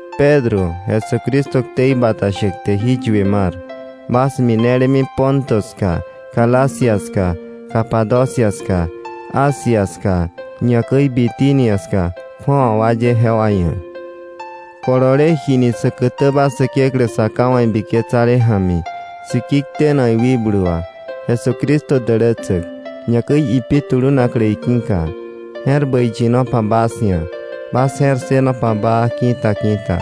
Pedro, Jesucristo ktei bata shäk te jí yue mar, bas minelemi Ponto ska, Galacia ska, Capadocia ska, Asia ska, ñakäi Bitinia ska, kju̱awa wa ye jewa ia̱; kolole jini säkätäba Säkeklä Sa Ká wa̱ ibiketsale ja̱mi, siki tenak iwikblu wà, Jesucristo dälätsäk, ñakäi ipi tulunaklä iki̱ka. Je̱r bäi yinopa bas ia̱, bas je̱r ssënopa baa ki̱ta ki̱ta.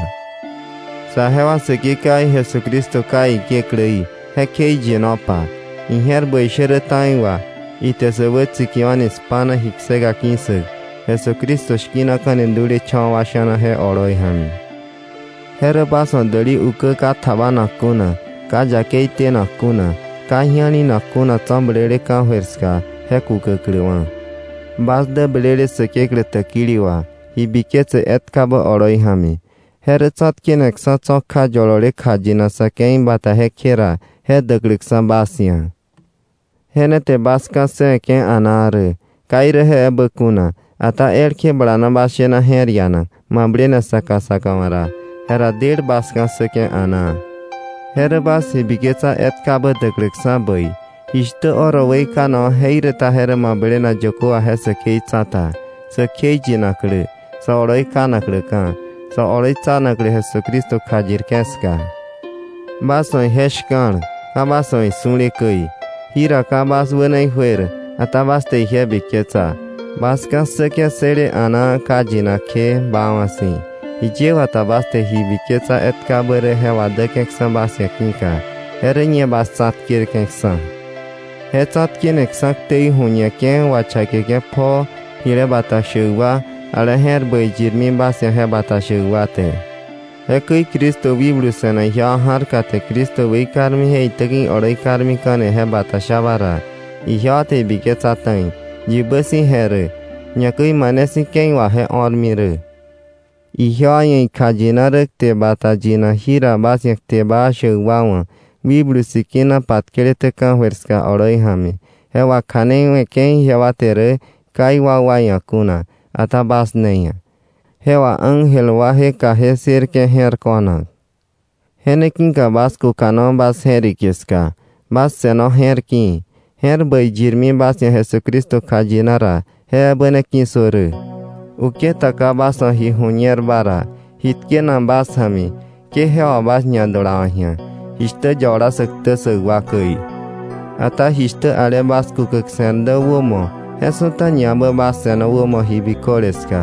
Saje wa Säkekewaí Jesucristo Ká iKekläí, je kjeiyinopa. Ije̱r bäi shä rä ta̱i wà, ite sä wätsikiwa̱ni spa̱na ji kseka ki̱ssäk, Jesucristo shki̱naka̱ni dulecha̱wa̱ wa sha̱na je oloi ja̱mi, je rä däli ukä ka tjabanak kuna, ka yakei tenak kuna, ka ji̱alinak kuna tso̱ blele ka̱jöir ska, je ne kukäkläwa̱ bas wa̱. Bas dä blele Säkeklä täkili wà ji biketse etkabä oloi ja̱mi, je rä tsa̱tkeneksa̱ tso̱ kja yolole kjayinak sa̱ ke̱i bata jekje ra, je däkläksa̱ bas ia̱. Je ne te bas ka̱ssëwe̱ke̱ a̱naa rä. Ka je ebä kuna, ata elkje balana bas shena je̱r ianak mablene saka saka wa̱ ra, jera del bas ka̱ssäke̱ a̱naa. Je rä bas ji biketsa etkabä däkläksa̱ bäi, jishtä oro weikanakwa̱ jeiräta je rä mablenak yökö wà je säkei tsa̱ta, sä kjeiyinaklä, sä oloi kanakläka̱, sä oloitsanaklä Jesucristo kjayirke̱ ska. Bas wa̱ ije shka̱l, ka bas wa̱ isu̱le käi. Jira ka bas wäna ijuer, ata bas te ije biketsa. Bas ka̱ssäke̱ ssële a̱naa ka yinak kje, baawa̱ si̱, jiye wata bas te ji biketsa etkabä rä je wadäke̱ksa̱ bas ia̱ ki̱ka, je rä ñe bas tsa̱tkerke̱ksa̱. Je tsa̱tkeneksa̱ ktei waju̱ñeke̱ wachakeke̱ pjoo, jile bata shäk wa, ale je̱r bäi yirmi bas ia̱ je bata shäkba wa te. Jekäi Cristo wikblu se̱nak ijewa ja̱rka te Cristo weikarmi je itäki̱ ioloi karmika̱ni je bata shaba ra, ijewa te ibiketsa ta̱i, yibä si̱ je rä, ñakäi mane si̱ ke̱i wà je o̱rmi rä. Ijewa ia̱ ikjayina rä kte bata yinak jira bas ia̱ kte baa shäk wa wa̱ Wikblu Sikina patkeleté ka̱jöir ska oloi ja̱mi, je wakja̱neiwe̱ke̱ ijewa te rä ka iwakwa ia̱ kuna, ata bas ne ia̱. Je wà ángel waje kaje ssërke̱ je̱r ko̱nak. Je ne ki̱ka bas kukano bas je̱rike ska. Bas se̱no je̱r ki̱i̱. Je̱r bäi yirmi bas ia̱ Jesucristo kjayina ra je ebä ne ki̱ssö rä. Uketa ka bas wa̱ ji ju̱ñerba ra, ji tkena bas ja̱mi, ke je wà bas ñadulawa̱k ji̱a, jishtä yabala sä ktä ssäk wa käi. Ata jishtä ale bas kukäk se̱r dä wämo, je su̱ta ñaebä bas se̱no wämo ji biköle ska.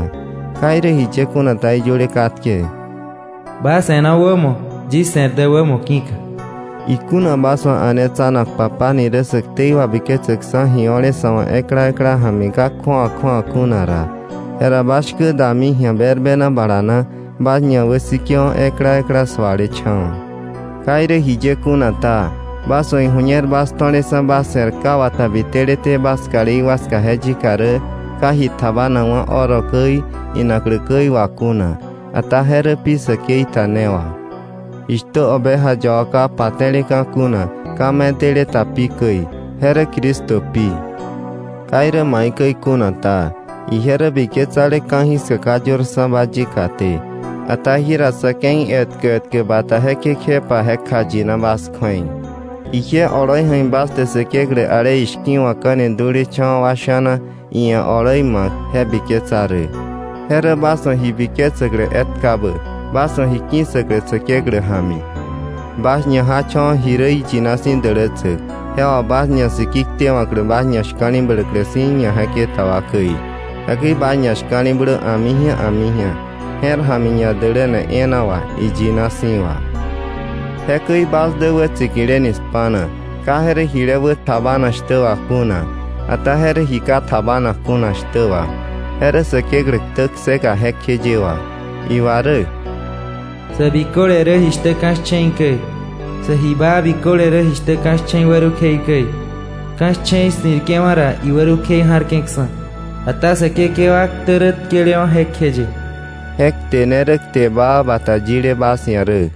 Ka irä jiye kuna ta, iyöle katke: “Bas se̱no wämo, yis se̱r dä wämo ki̱ka.” Ikuna bas wa̱ a̱netsanak Papá ni rä sä ktei wabiketsäkksa̱ ji o̱le sa̱ wa̱ ekla ekla ja̱mi ka kju̱awa kju̱awa kuna ra, jera bas shkä dami ji̱a berbena bala na, bas ñawäsike̱wo̱ ekla ekla sualecha̱wa̱. Ka irä jiye kuna ta, bas wa̱ iju̱ñer bas to̱leksa̱ bas se̱r ka wata biteleté bas kalí wa ska je yika rä, ka ji tjabanakwa̱ oro käi, inaklä käi wà kuna, ata je rä pi säkei ta je ne wà, jishtä oveja yaba ka pate̱leka̱ kuna, ka medele ta pi käi, je rä Cristo pi. Ka irä maikäi kuna ta, ije rä biketsale ka̱jiska ka yörksa̱ba yikaté, ata jira sa̱ ke̱i etkä etkä bata jekje kjepa je kjayina bas kju̱ei. Ije oloi ja̱mi bas te Säkeklä ale ishki̱wa̱kka̱ni dulecha̱wa̱ wa sha̱na, iia̱ oloi ma̱k, je biketsa rä. Je rä bas wa̱ ji biketsäklä etkabä, bas wa̱ ji ki̱ssäklä, Säkeklä ja̱mi. Bas ñajacha̱wa̱ ji rä iyina si̱ dälätsäk, je wà bas je̱k siki tewa̱ bas ñashka̱li̱bläklä si̱ ñaje̱keta wa käi. Jekäi bas ñashka̱li̱blö a̱miji̱a a̱miji̱a, je̱r ja̱mi ñadäläle e̱e̱na wà, iyina si̱ wà. Jekäi bas dä wätsikileni spa̱na, ka je rä jile wä tjabanak shtä wà kuna, ata je rä ji ka tjabanak kuna shtä wà, je rä Säkeklä ktä kseka jekjeye wà. Iwa rä: “Sä biköle rä jishtä ka̱ shche̱i käi, sä ji baa biköle rä jishtä ka̱ shche̱i wärukjei käi. Ka̱ shche̱i ssi̱rke̱wa̱ ra, iwärukjei ja̱rke̱ksa̱. Ata Säkekewa ktä rä tkelewa̱ jekjeye.” Je kte ne rä kte baa bata yile bas ia̱ rä.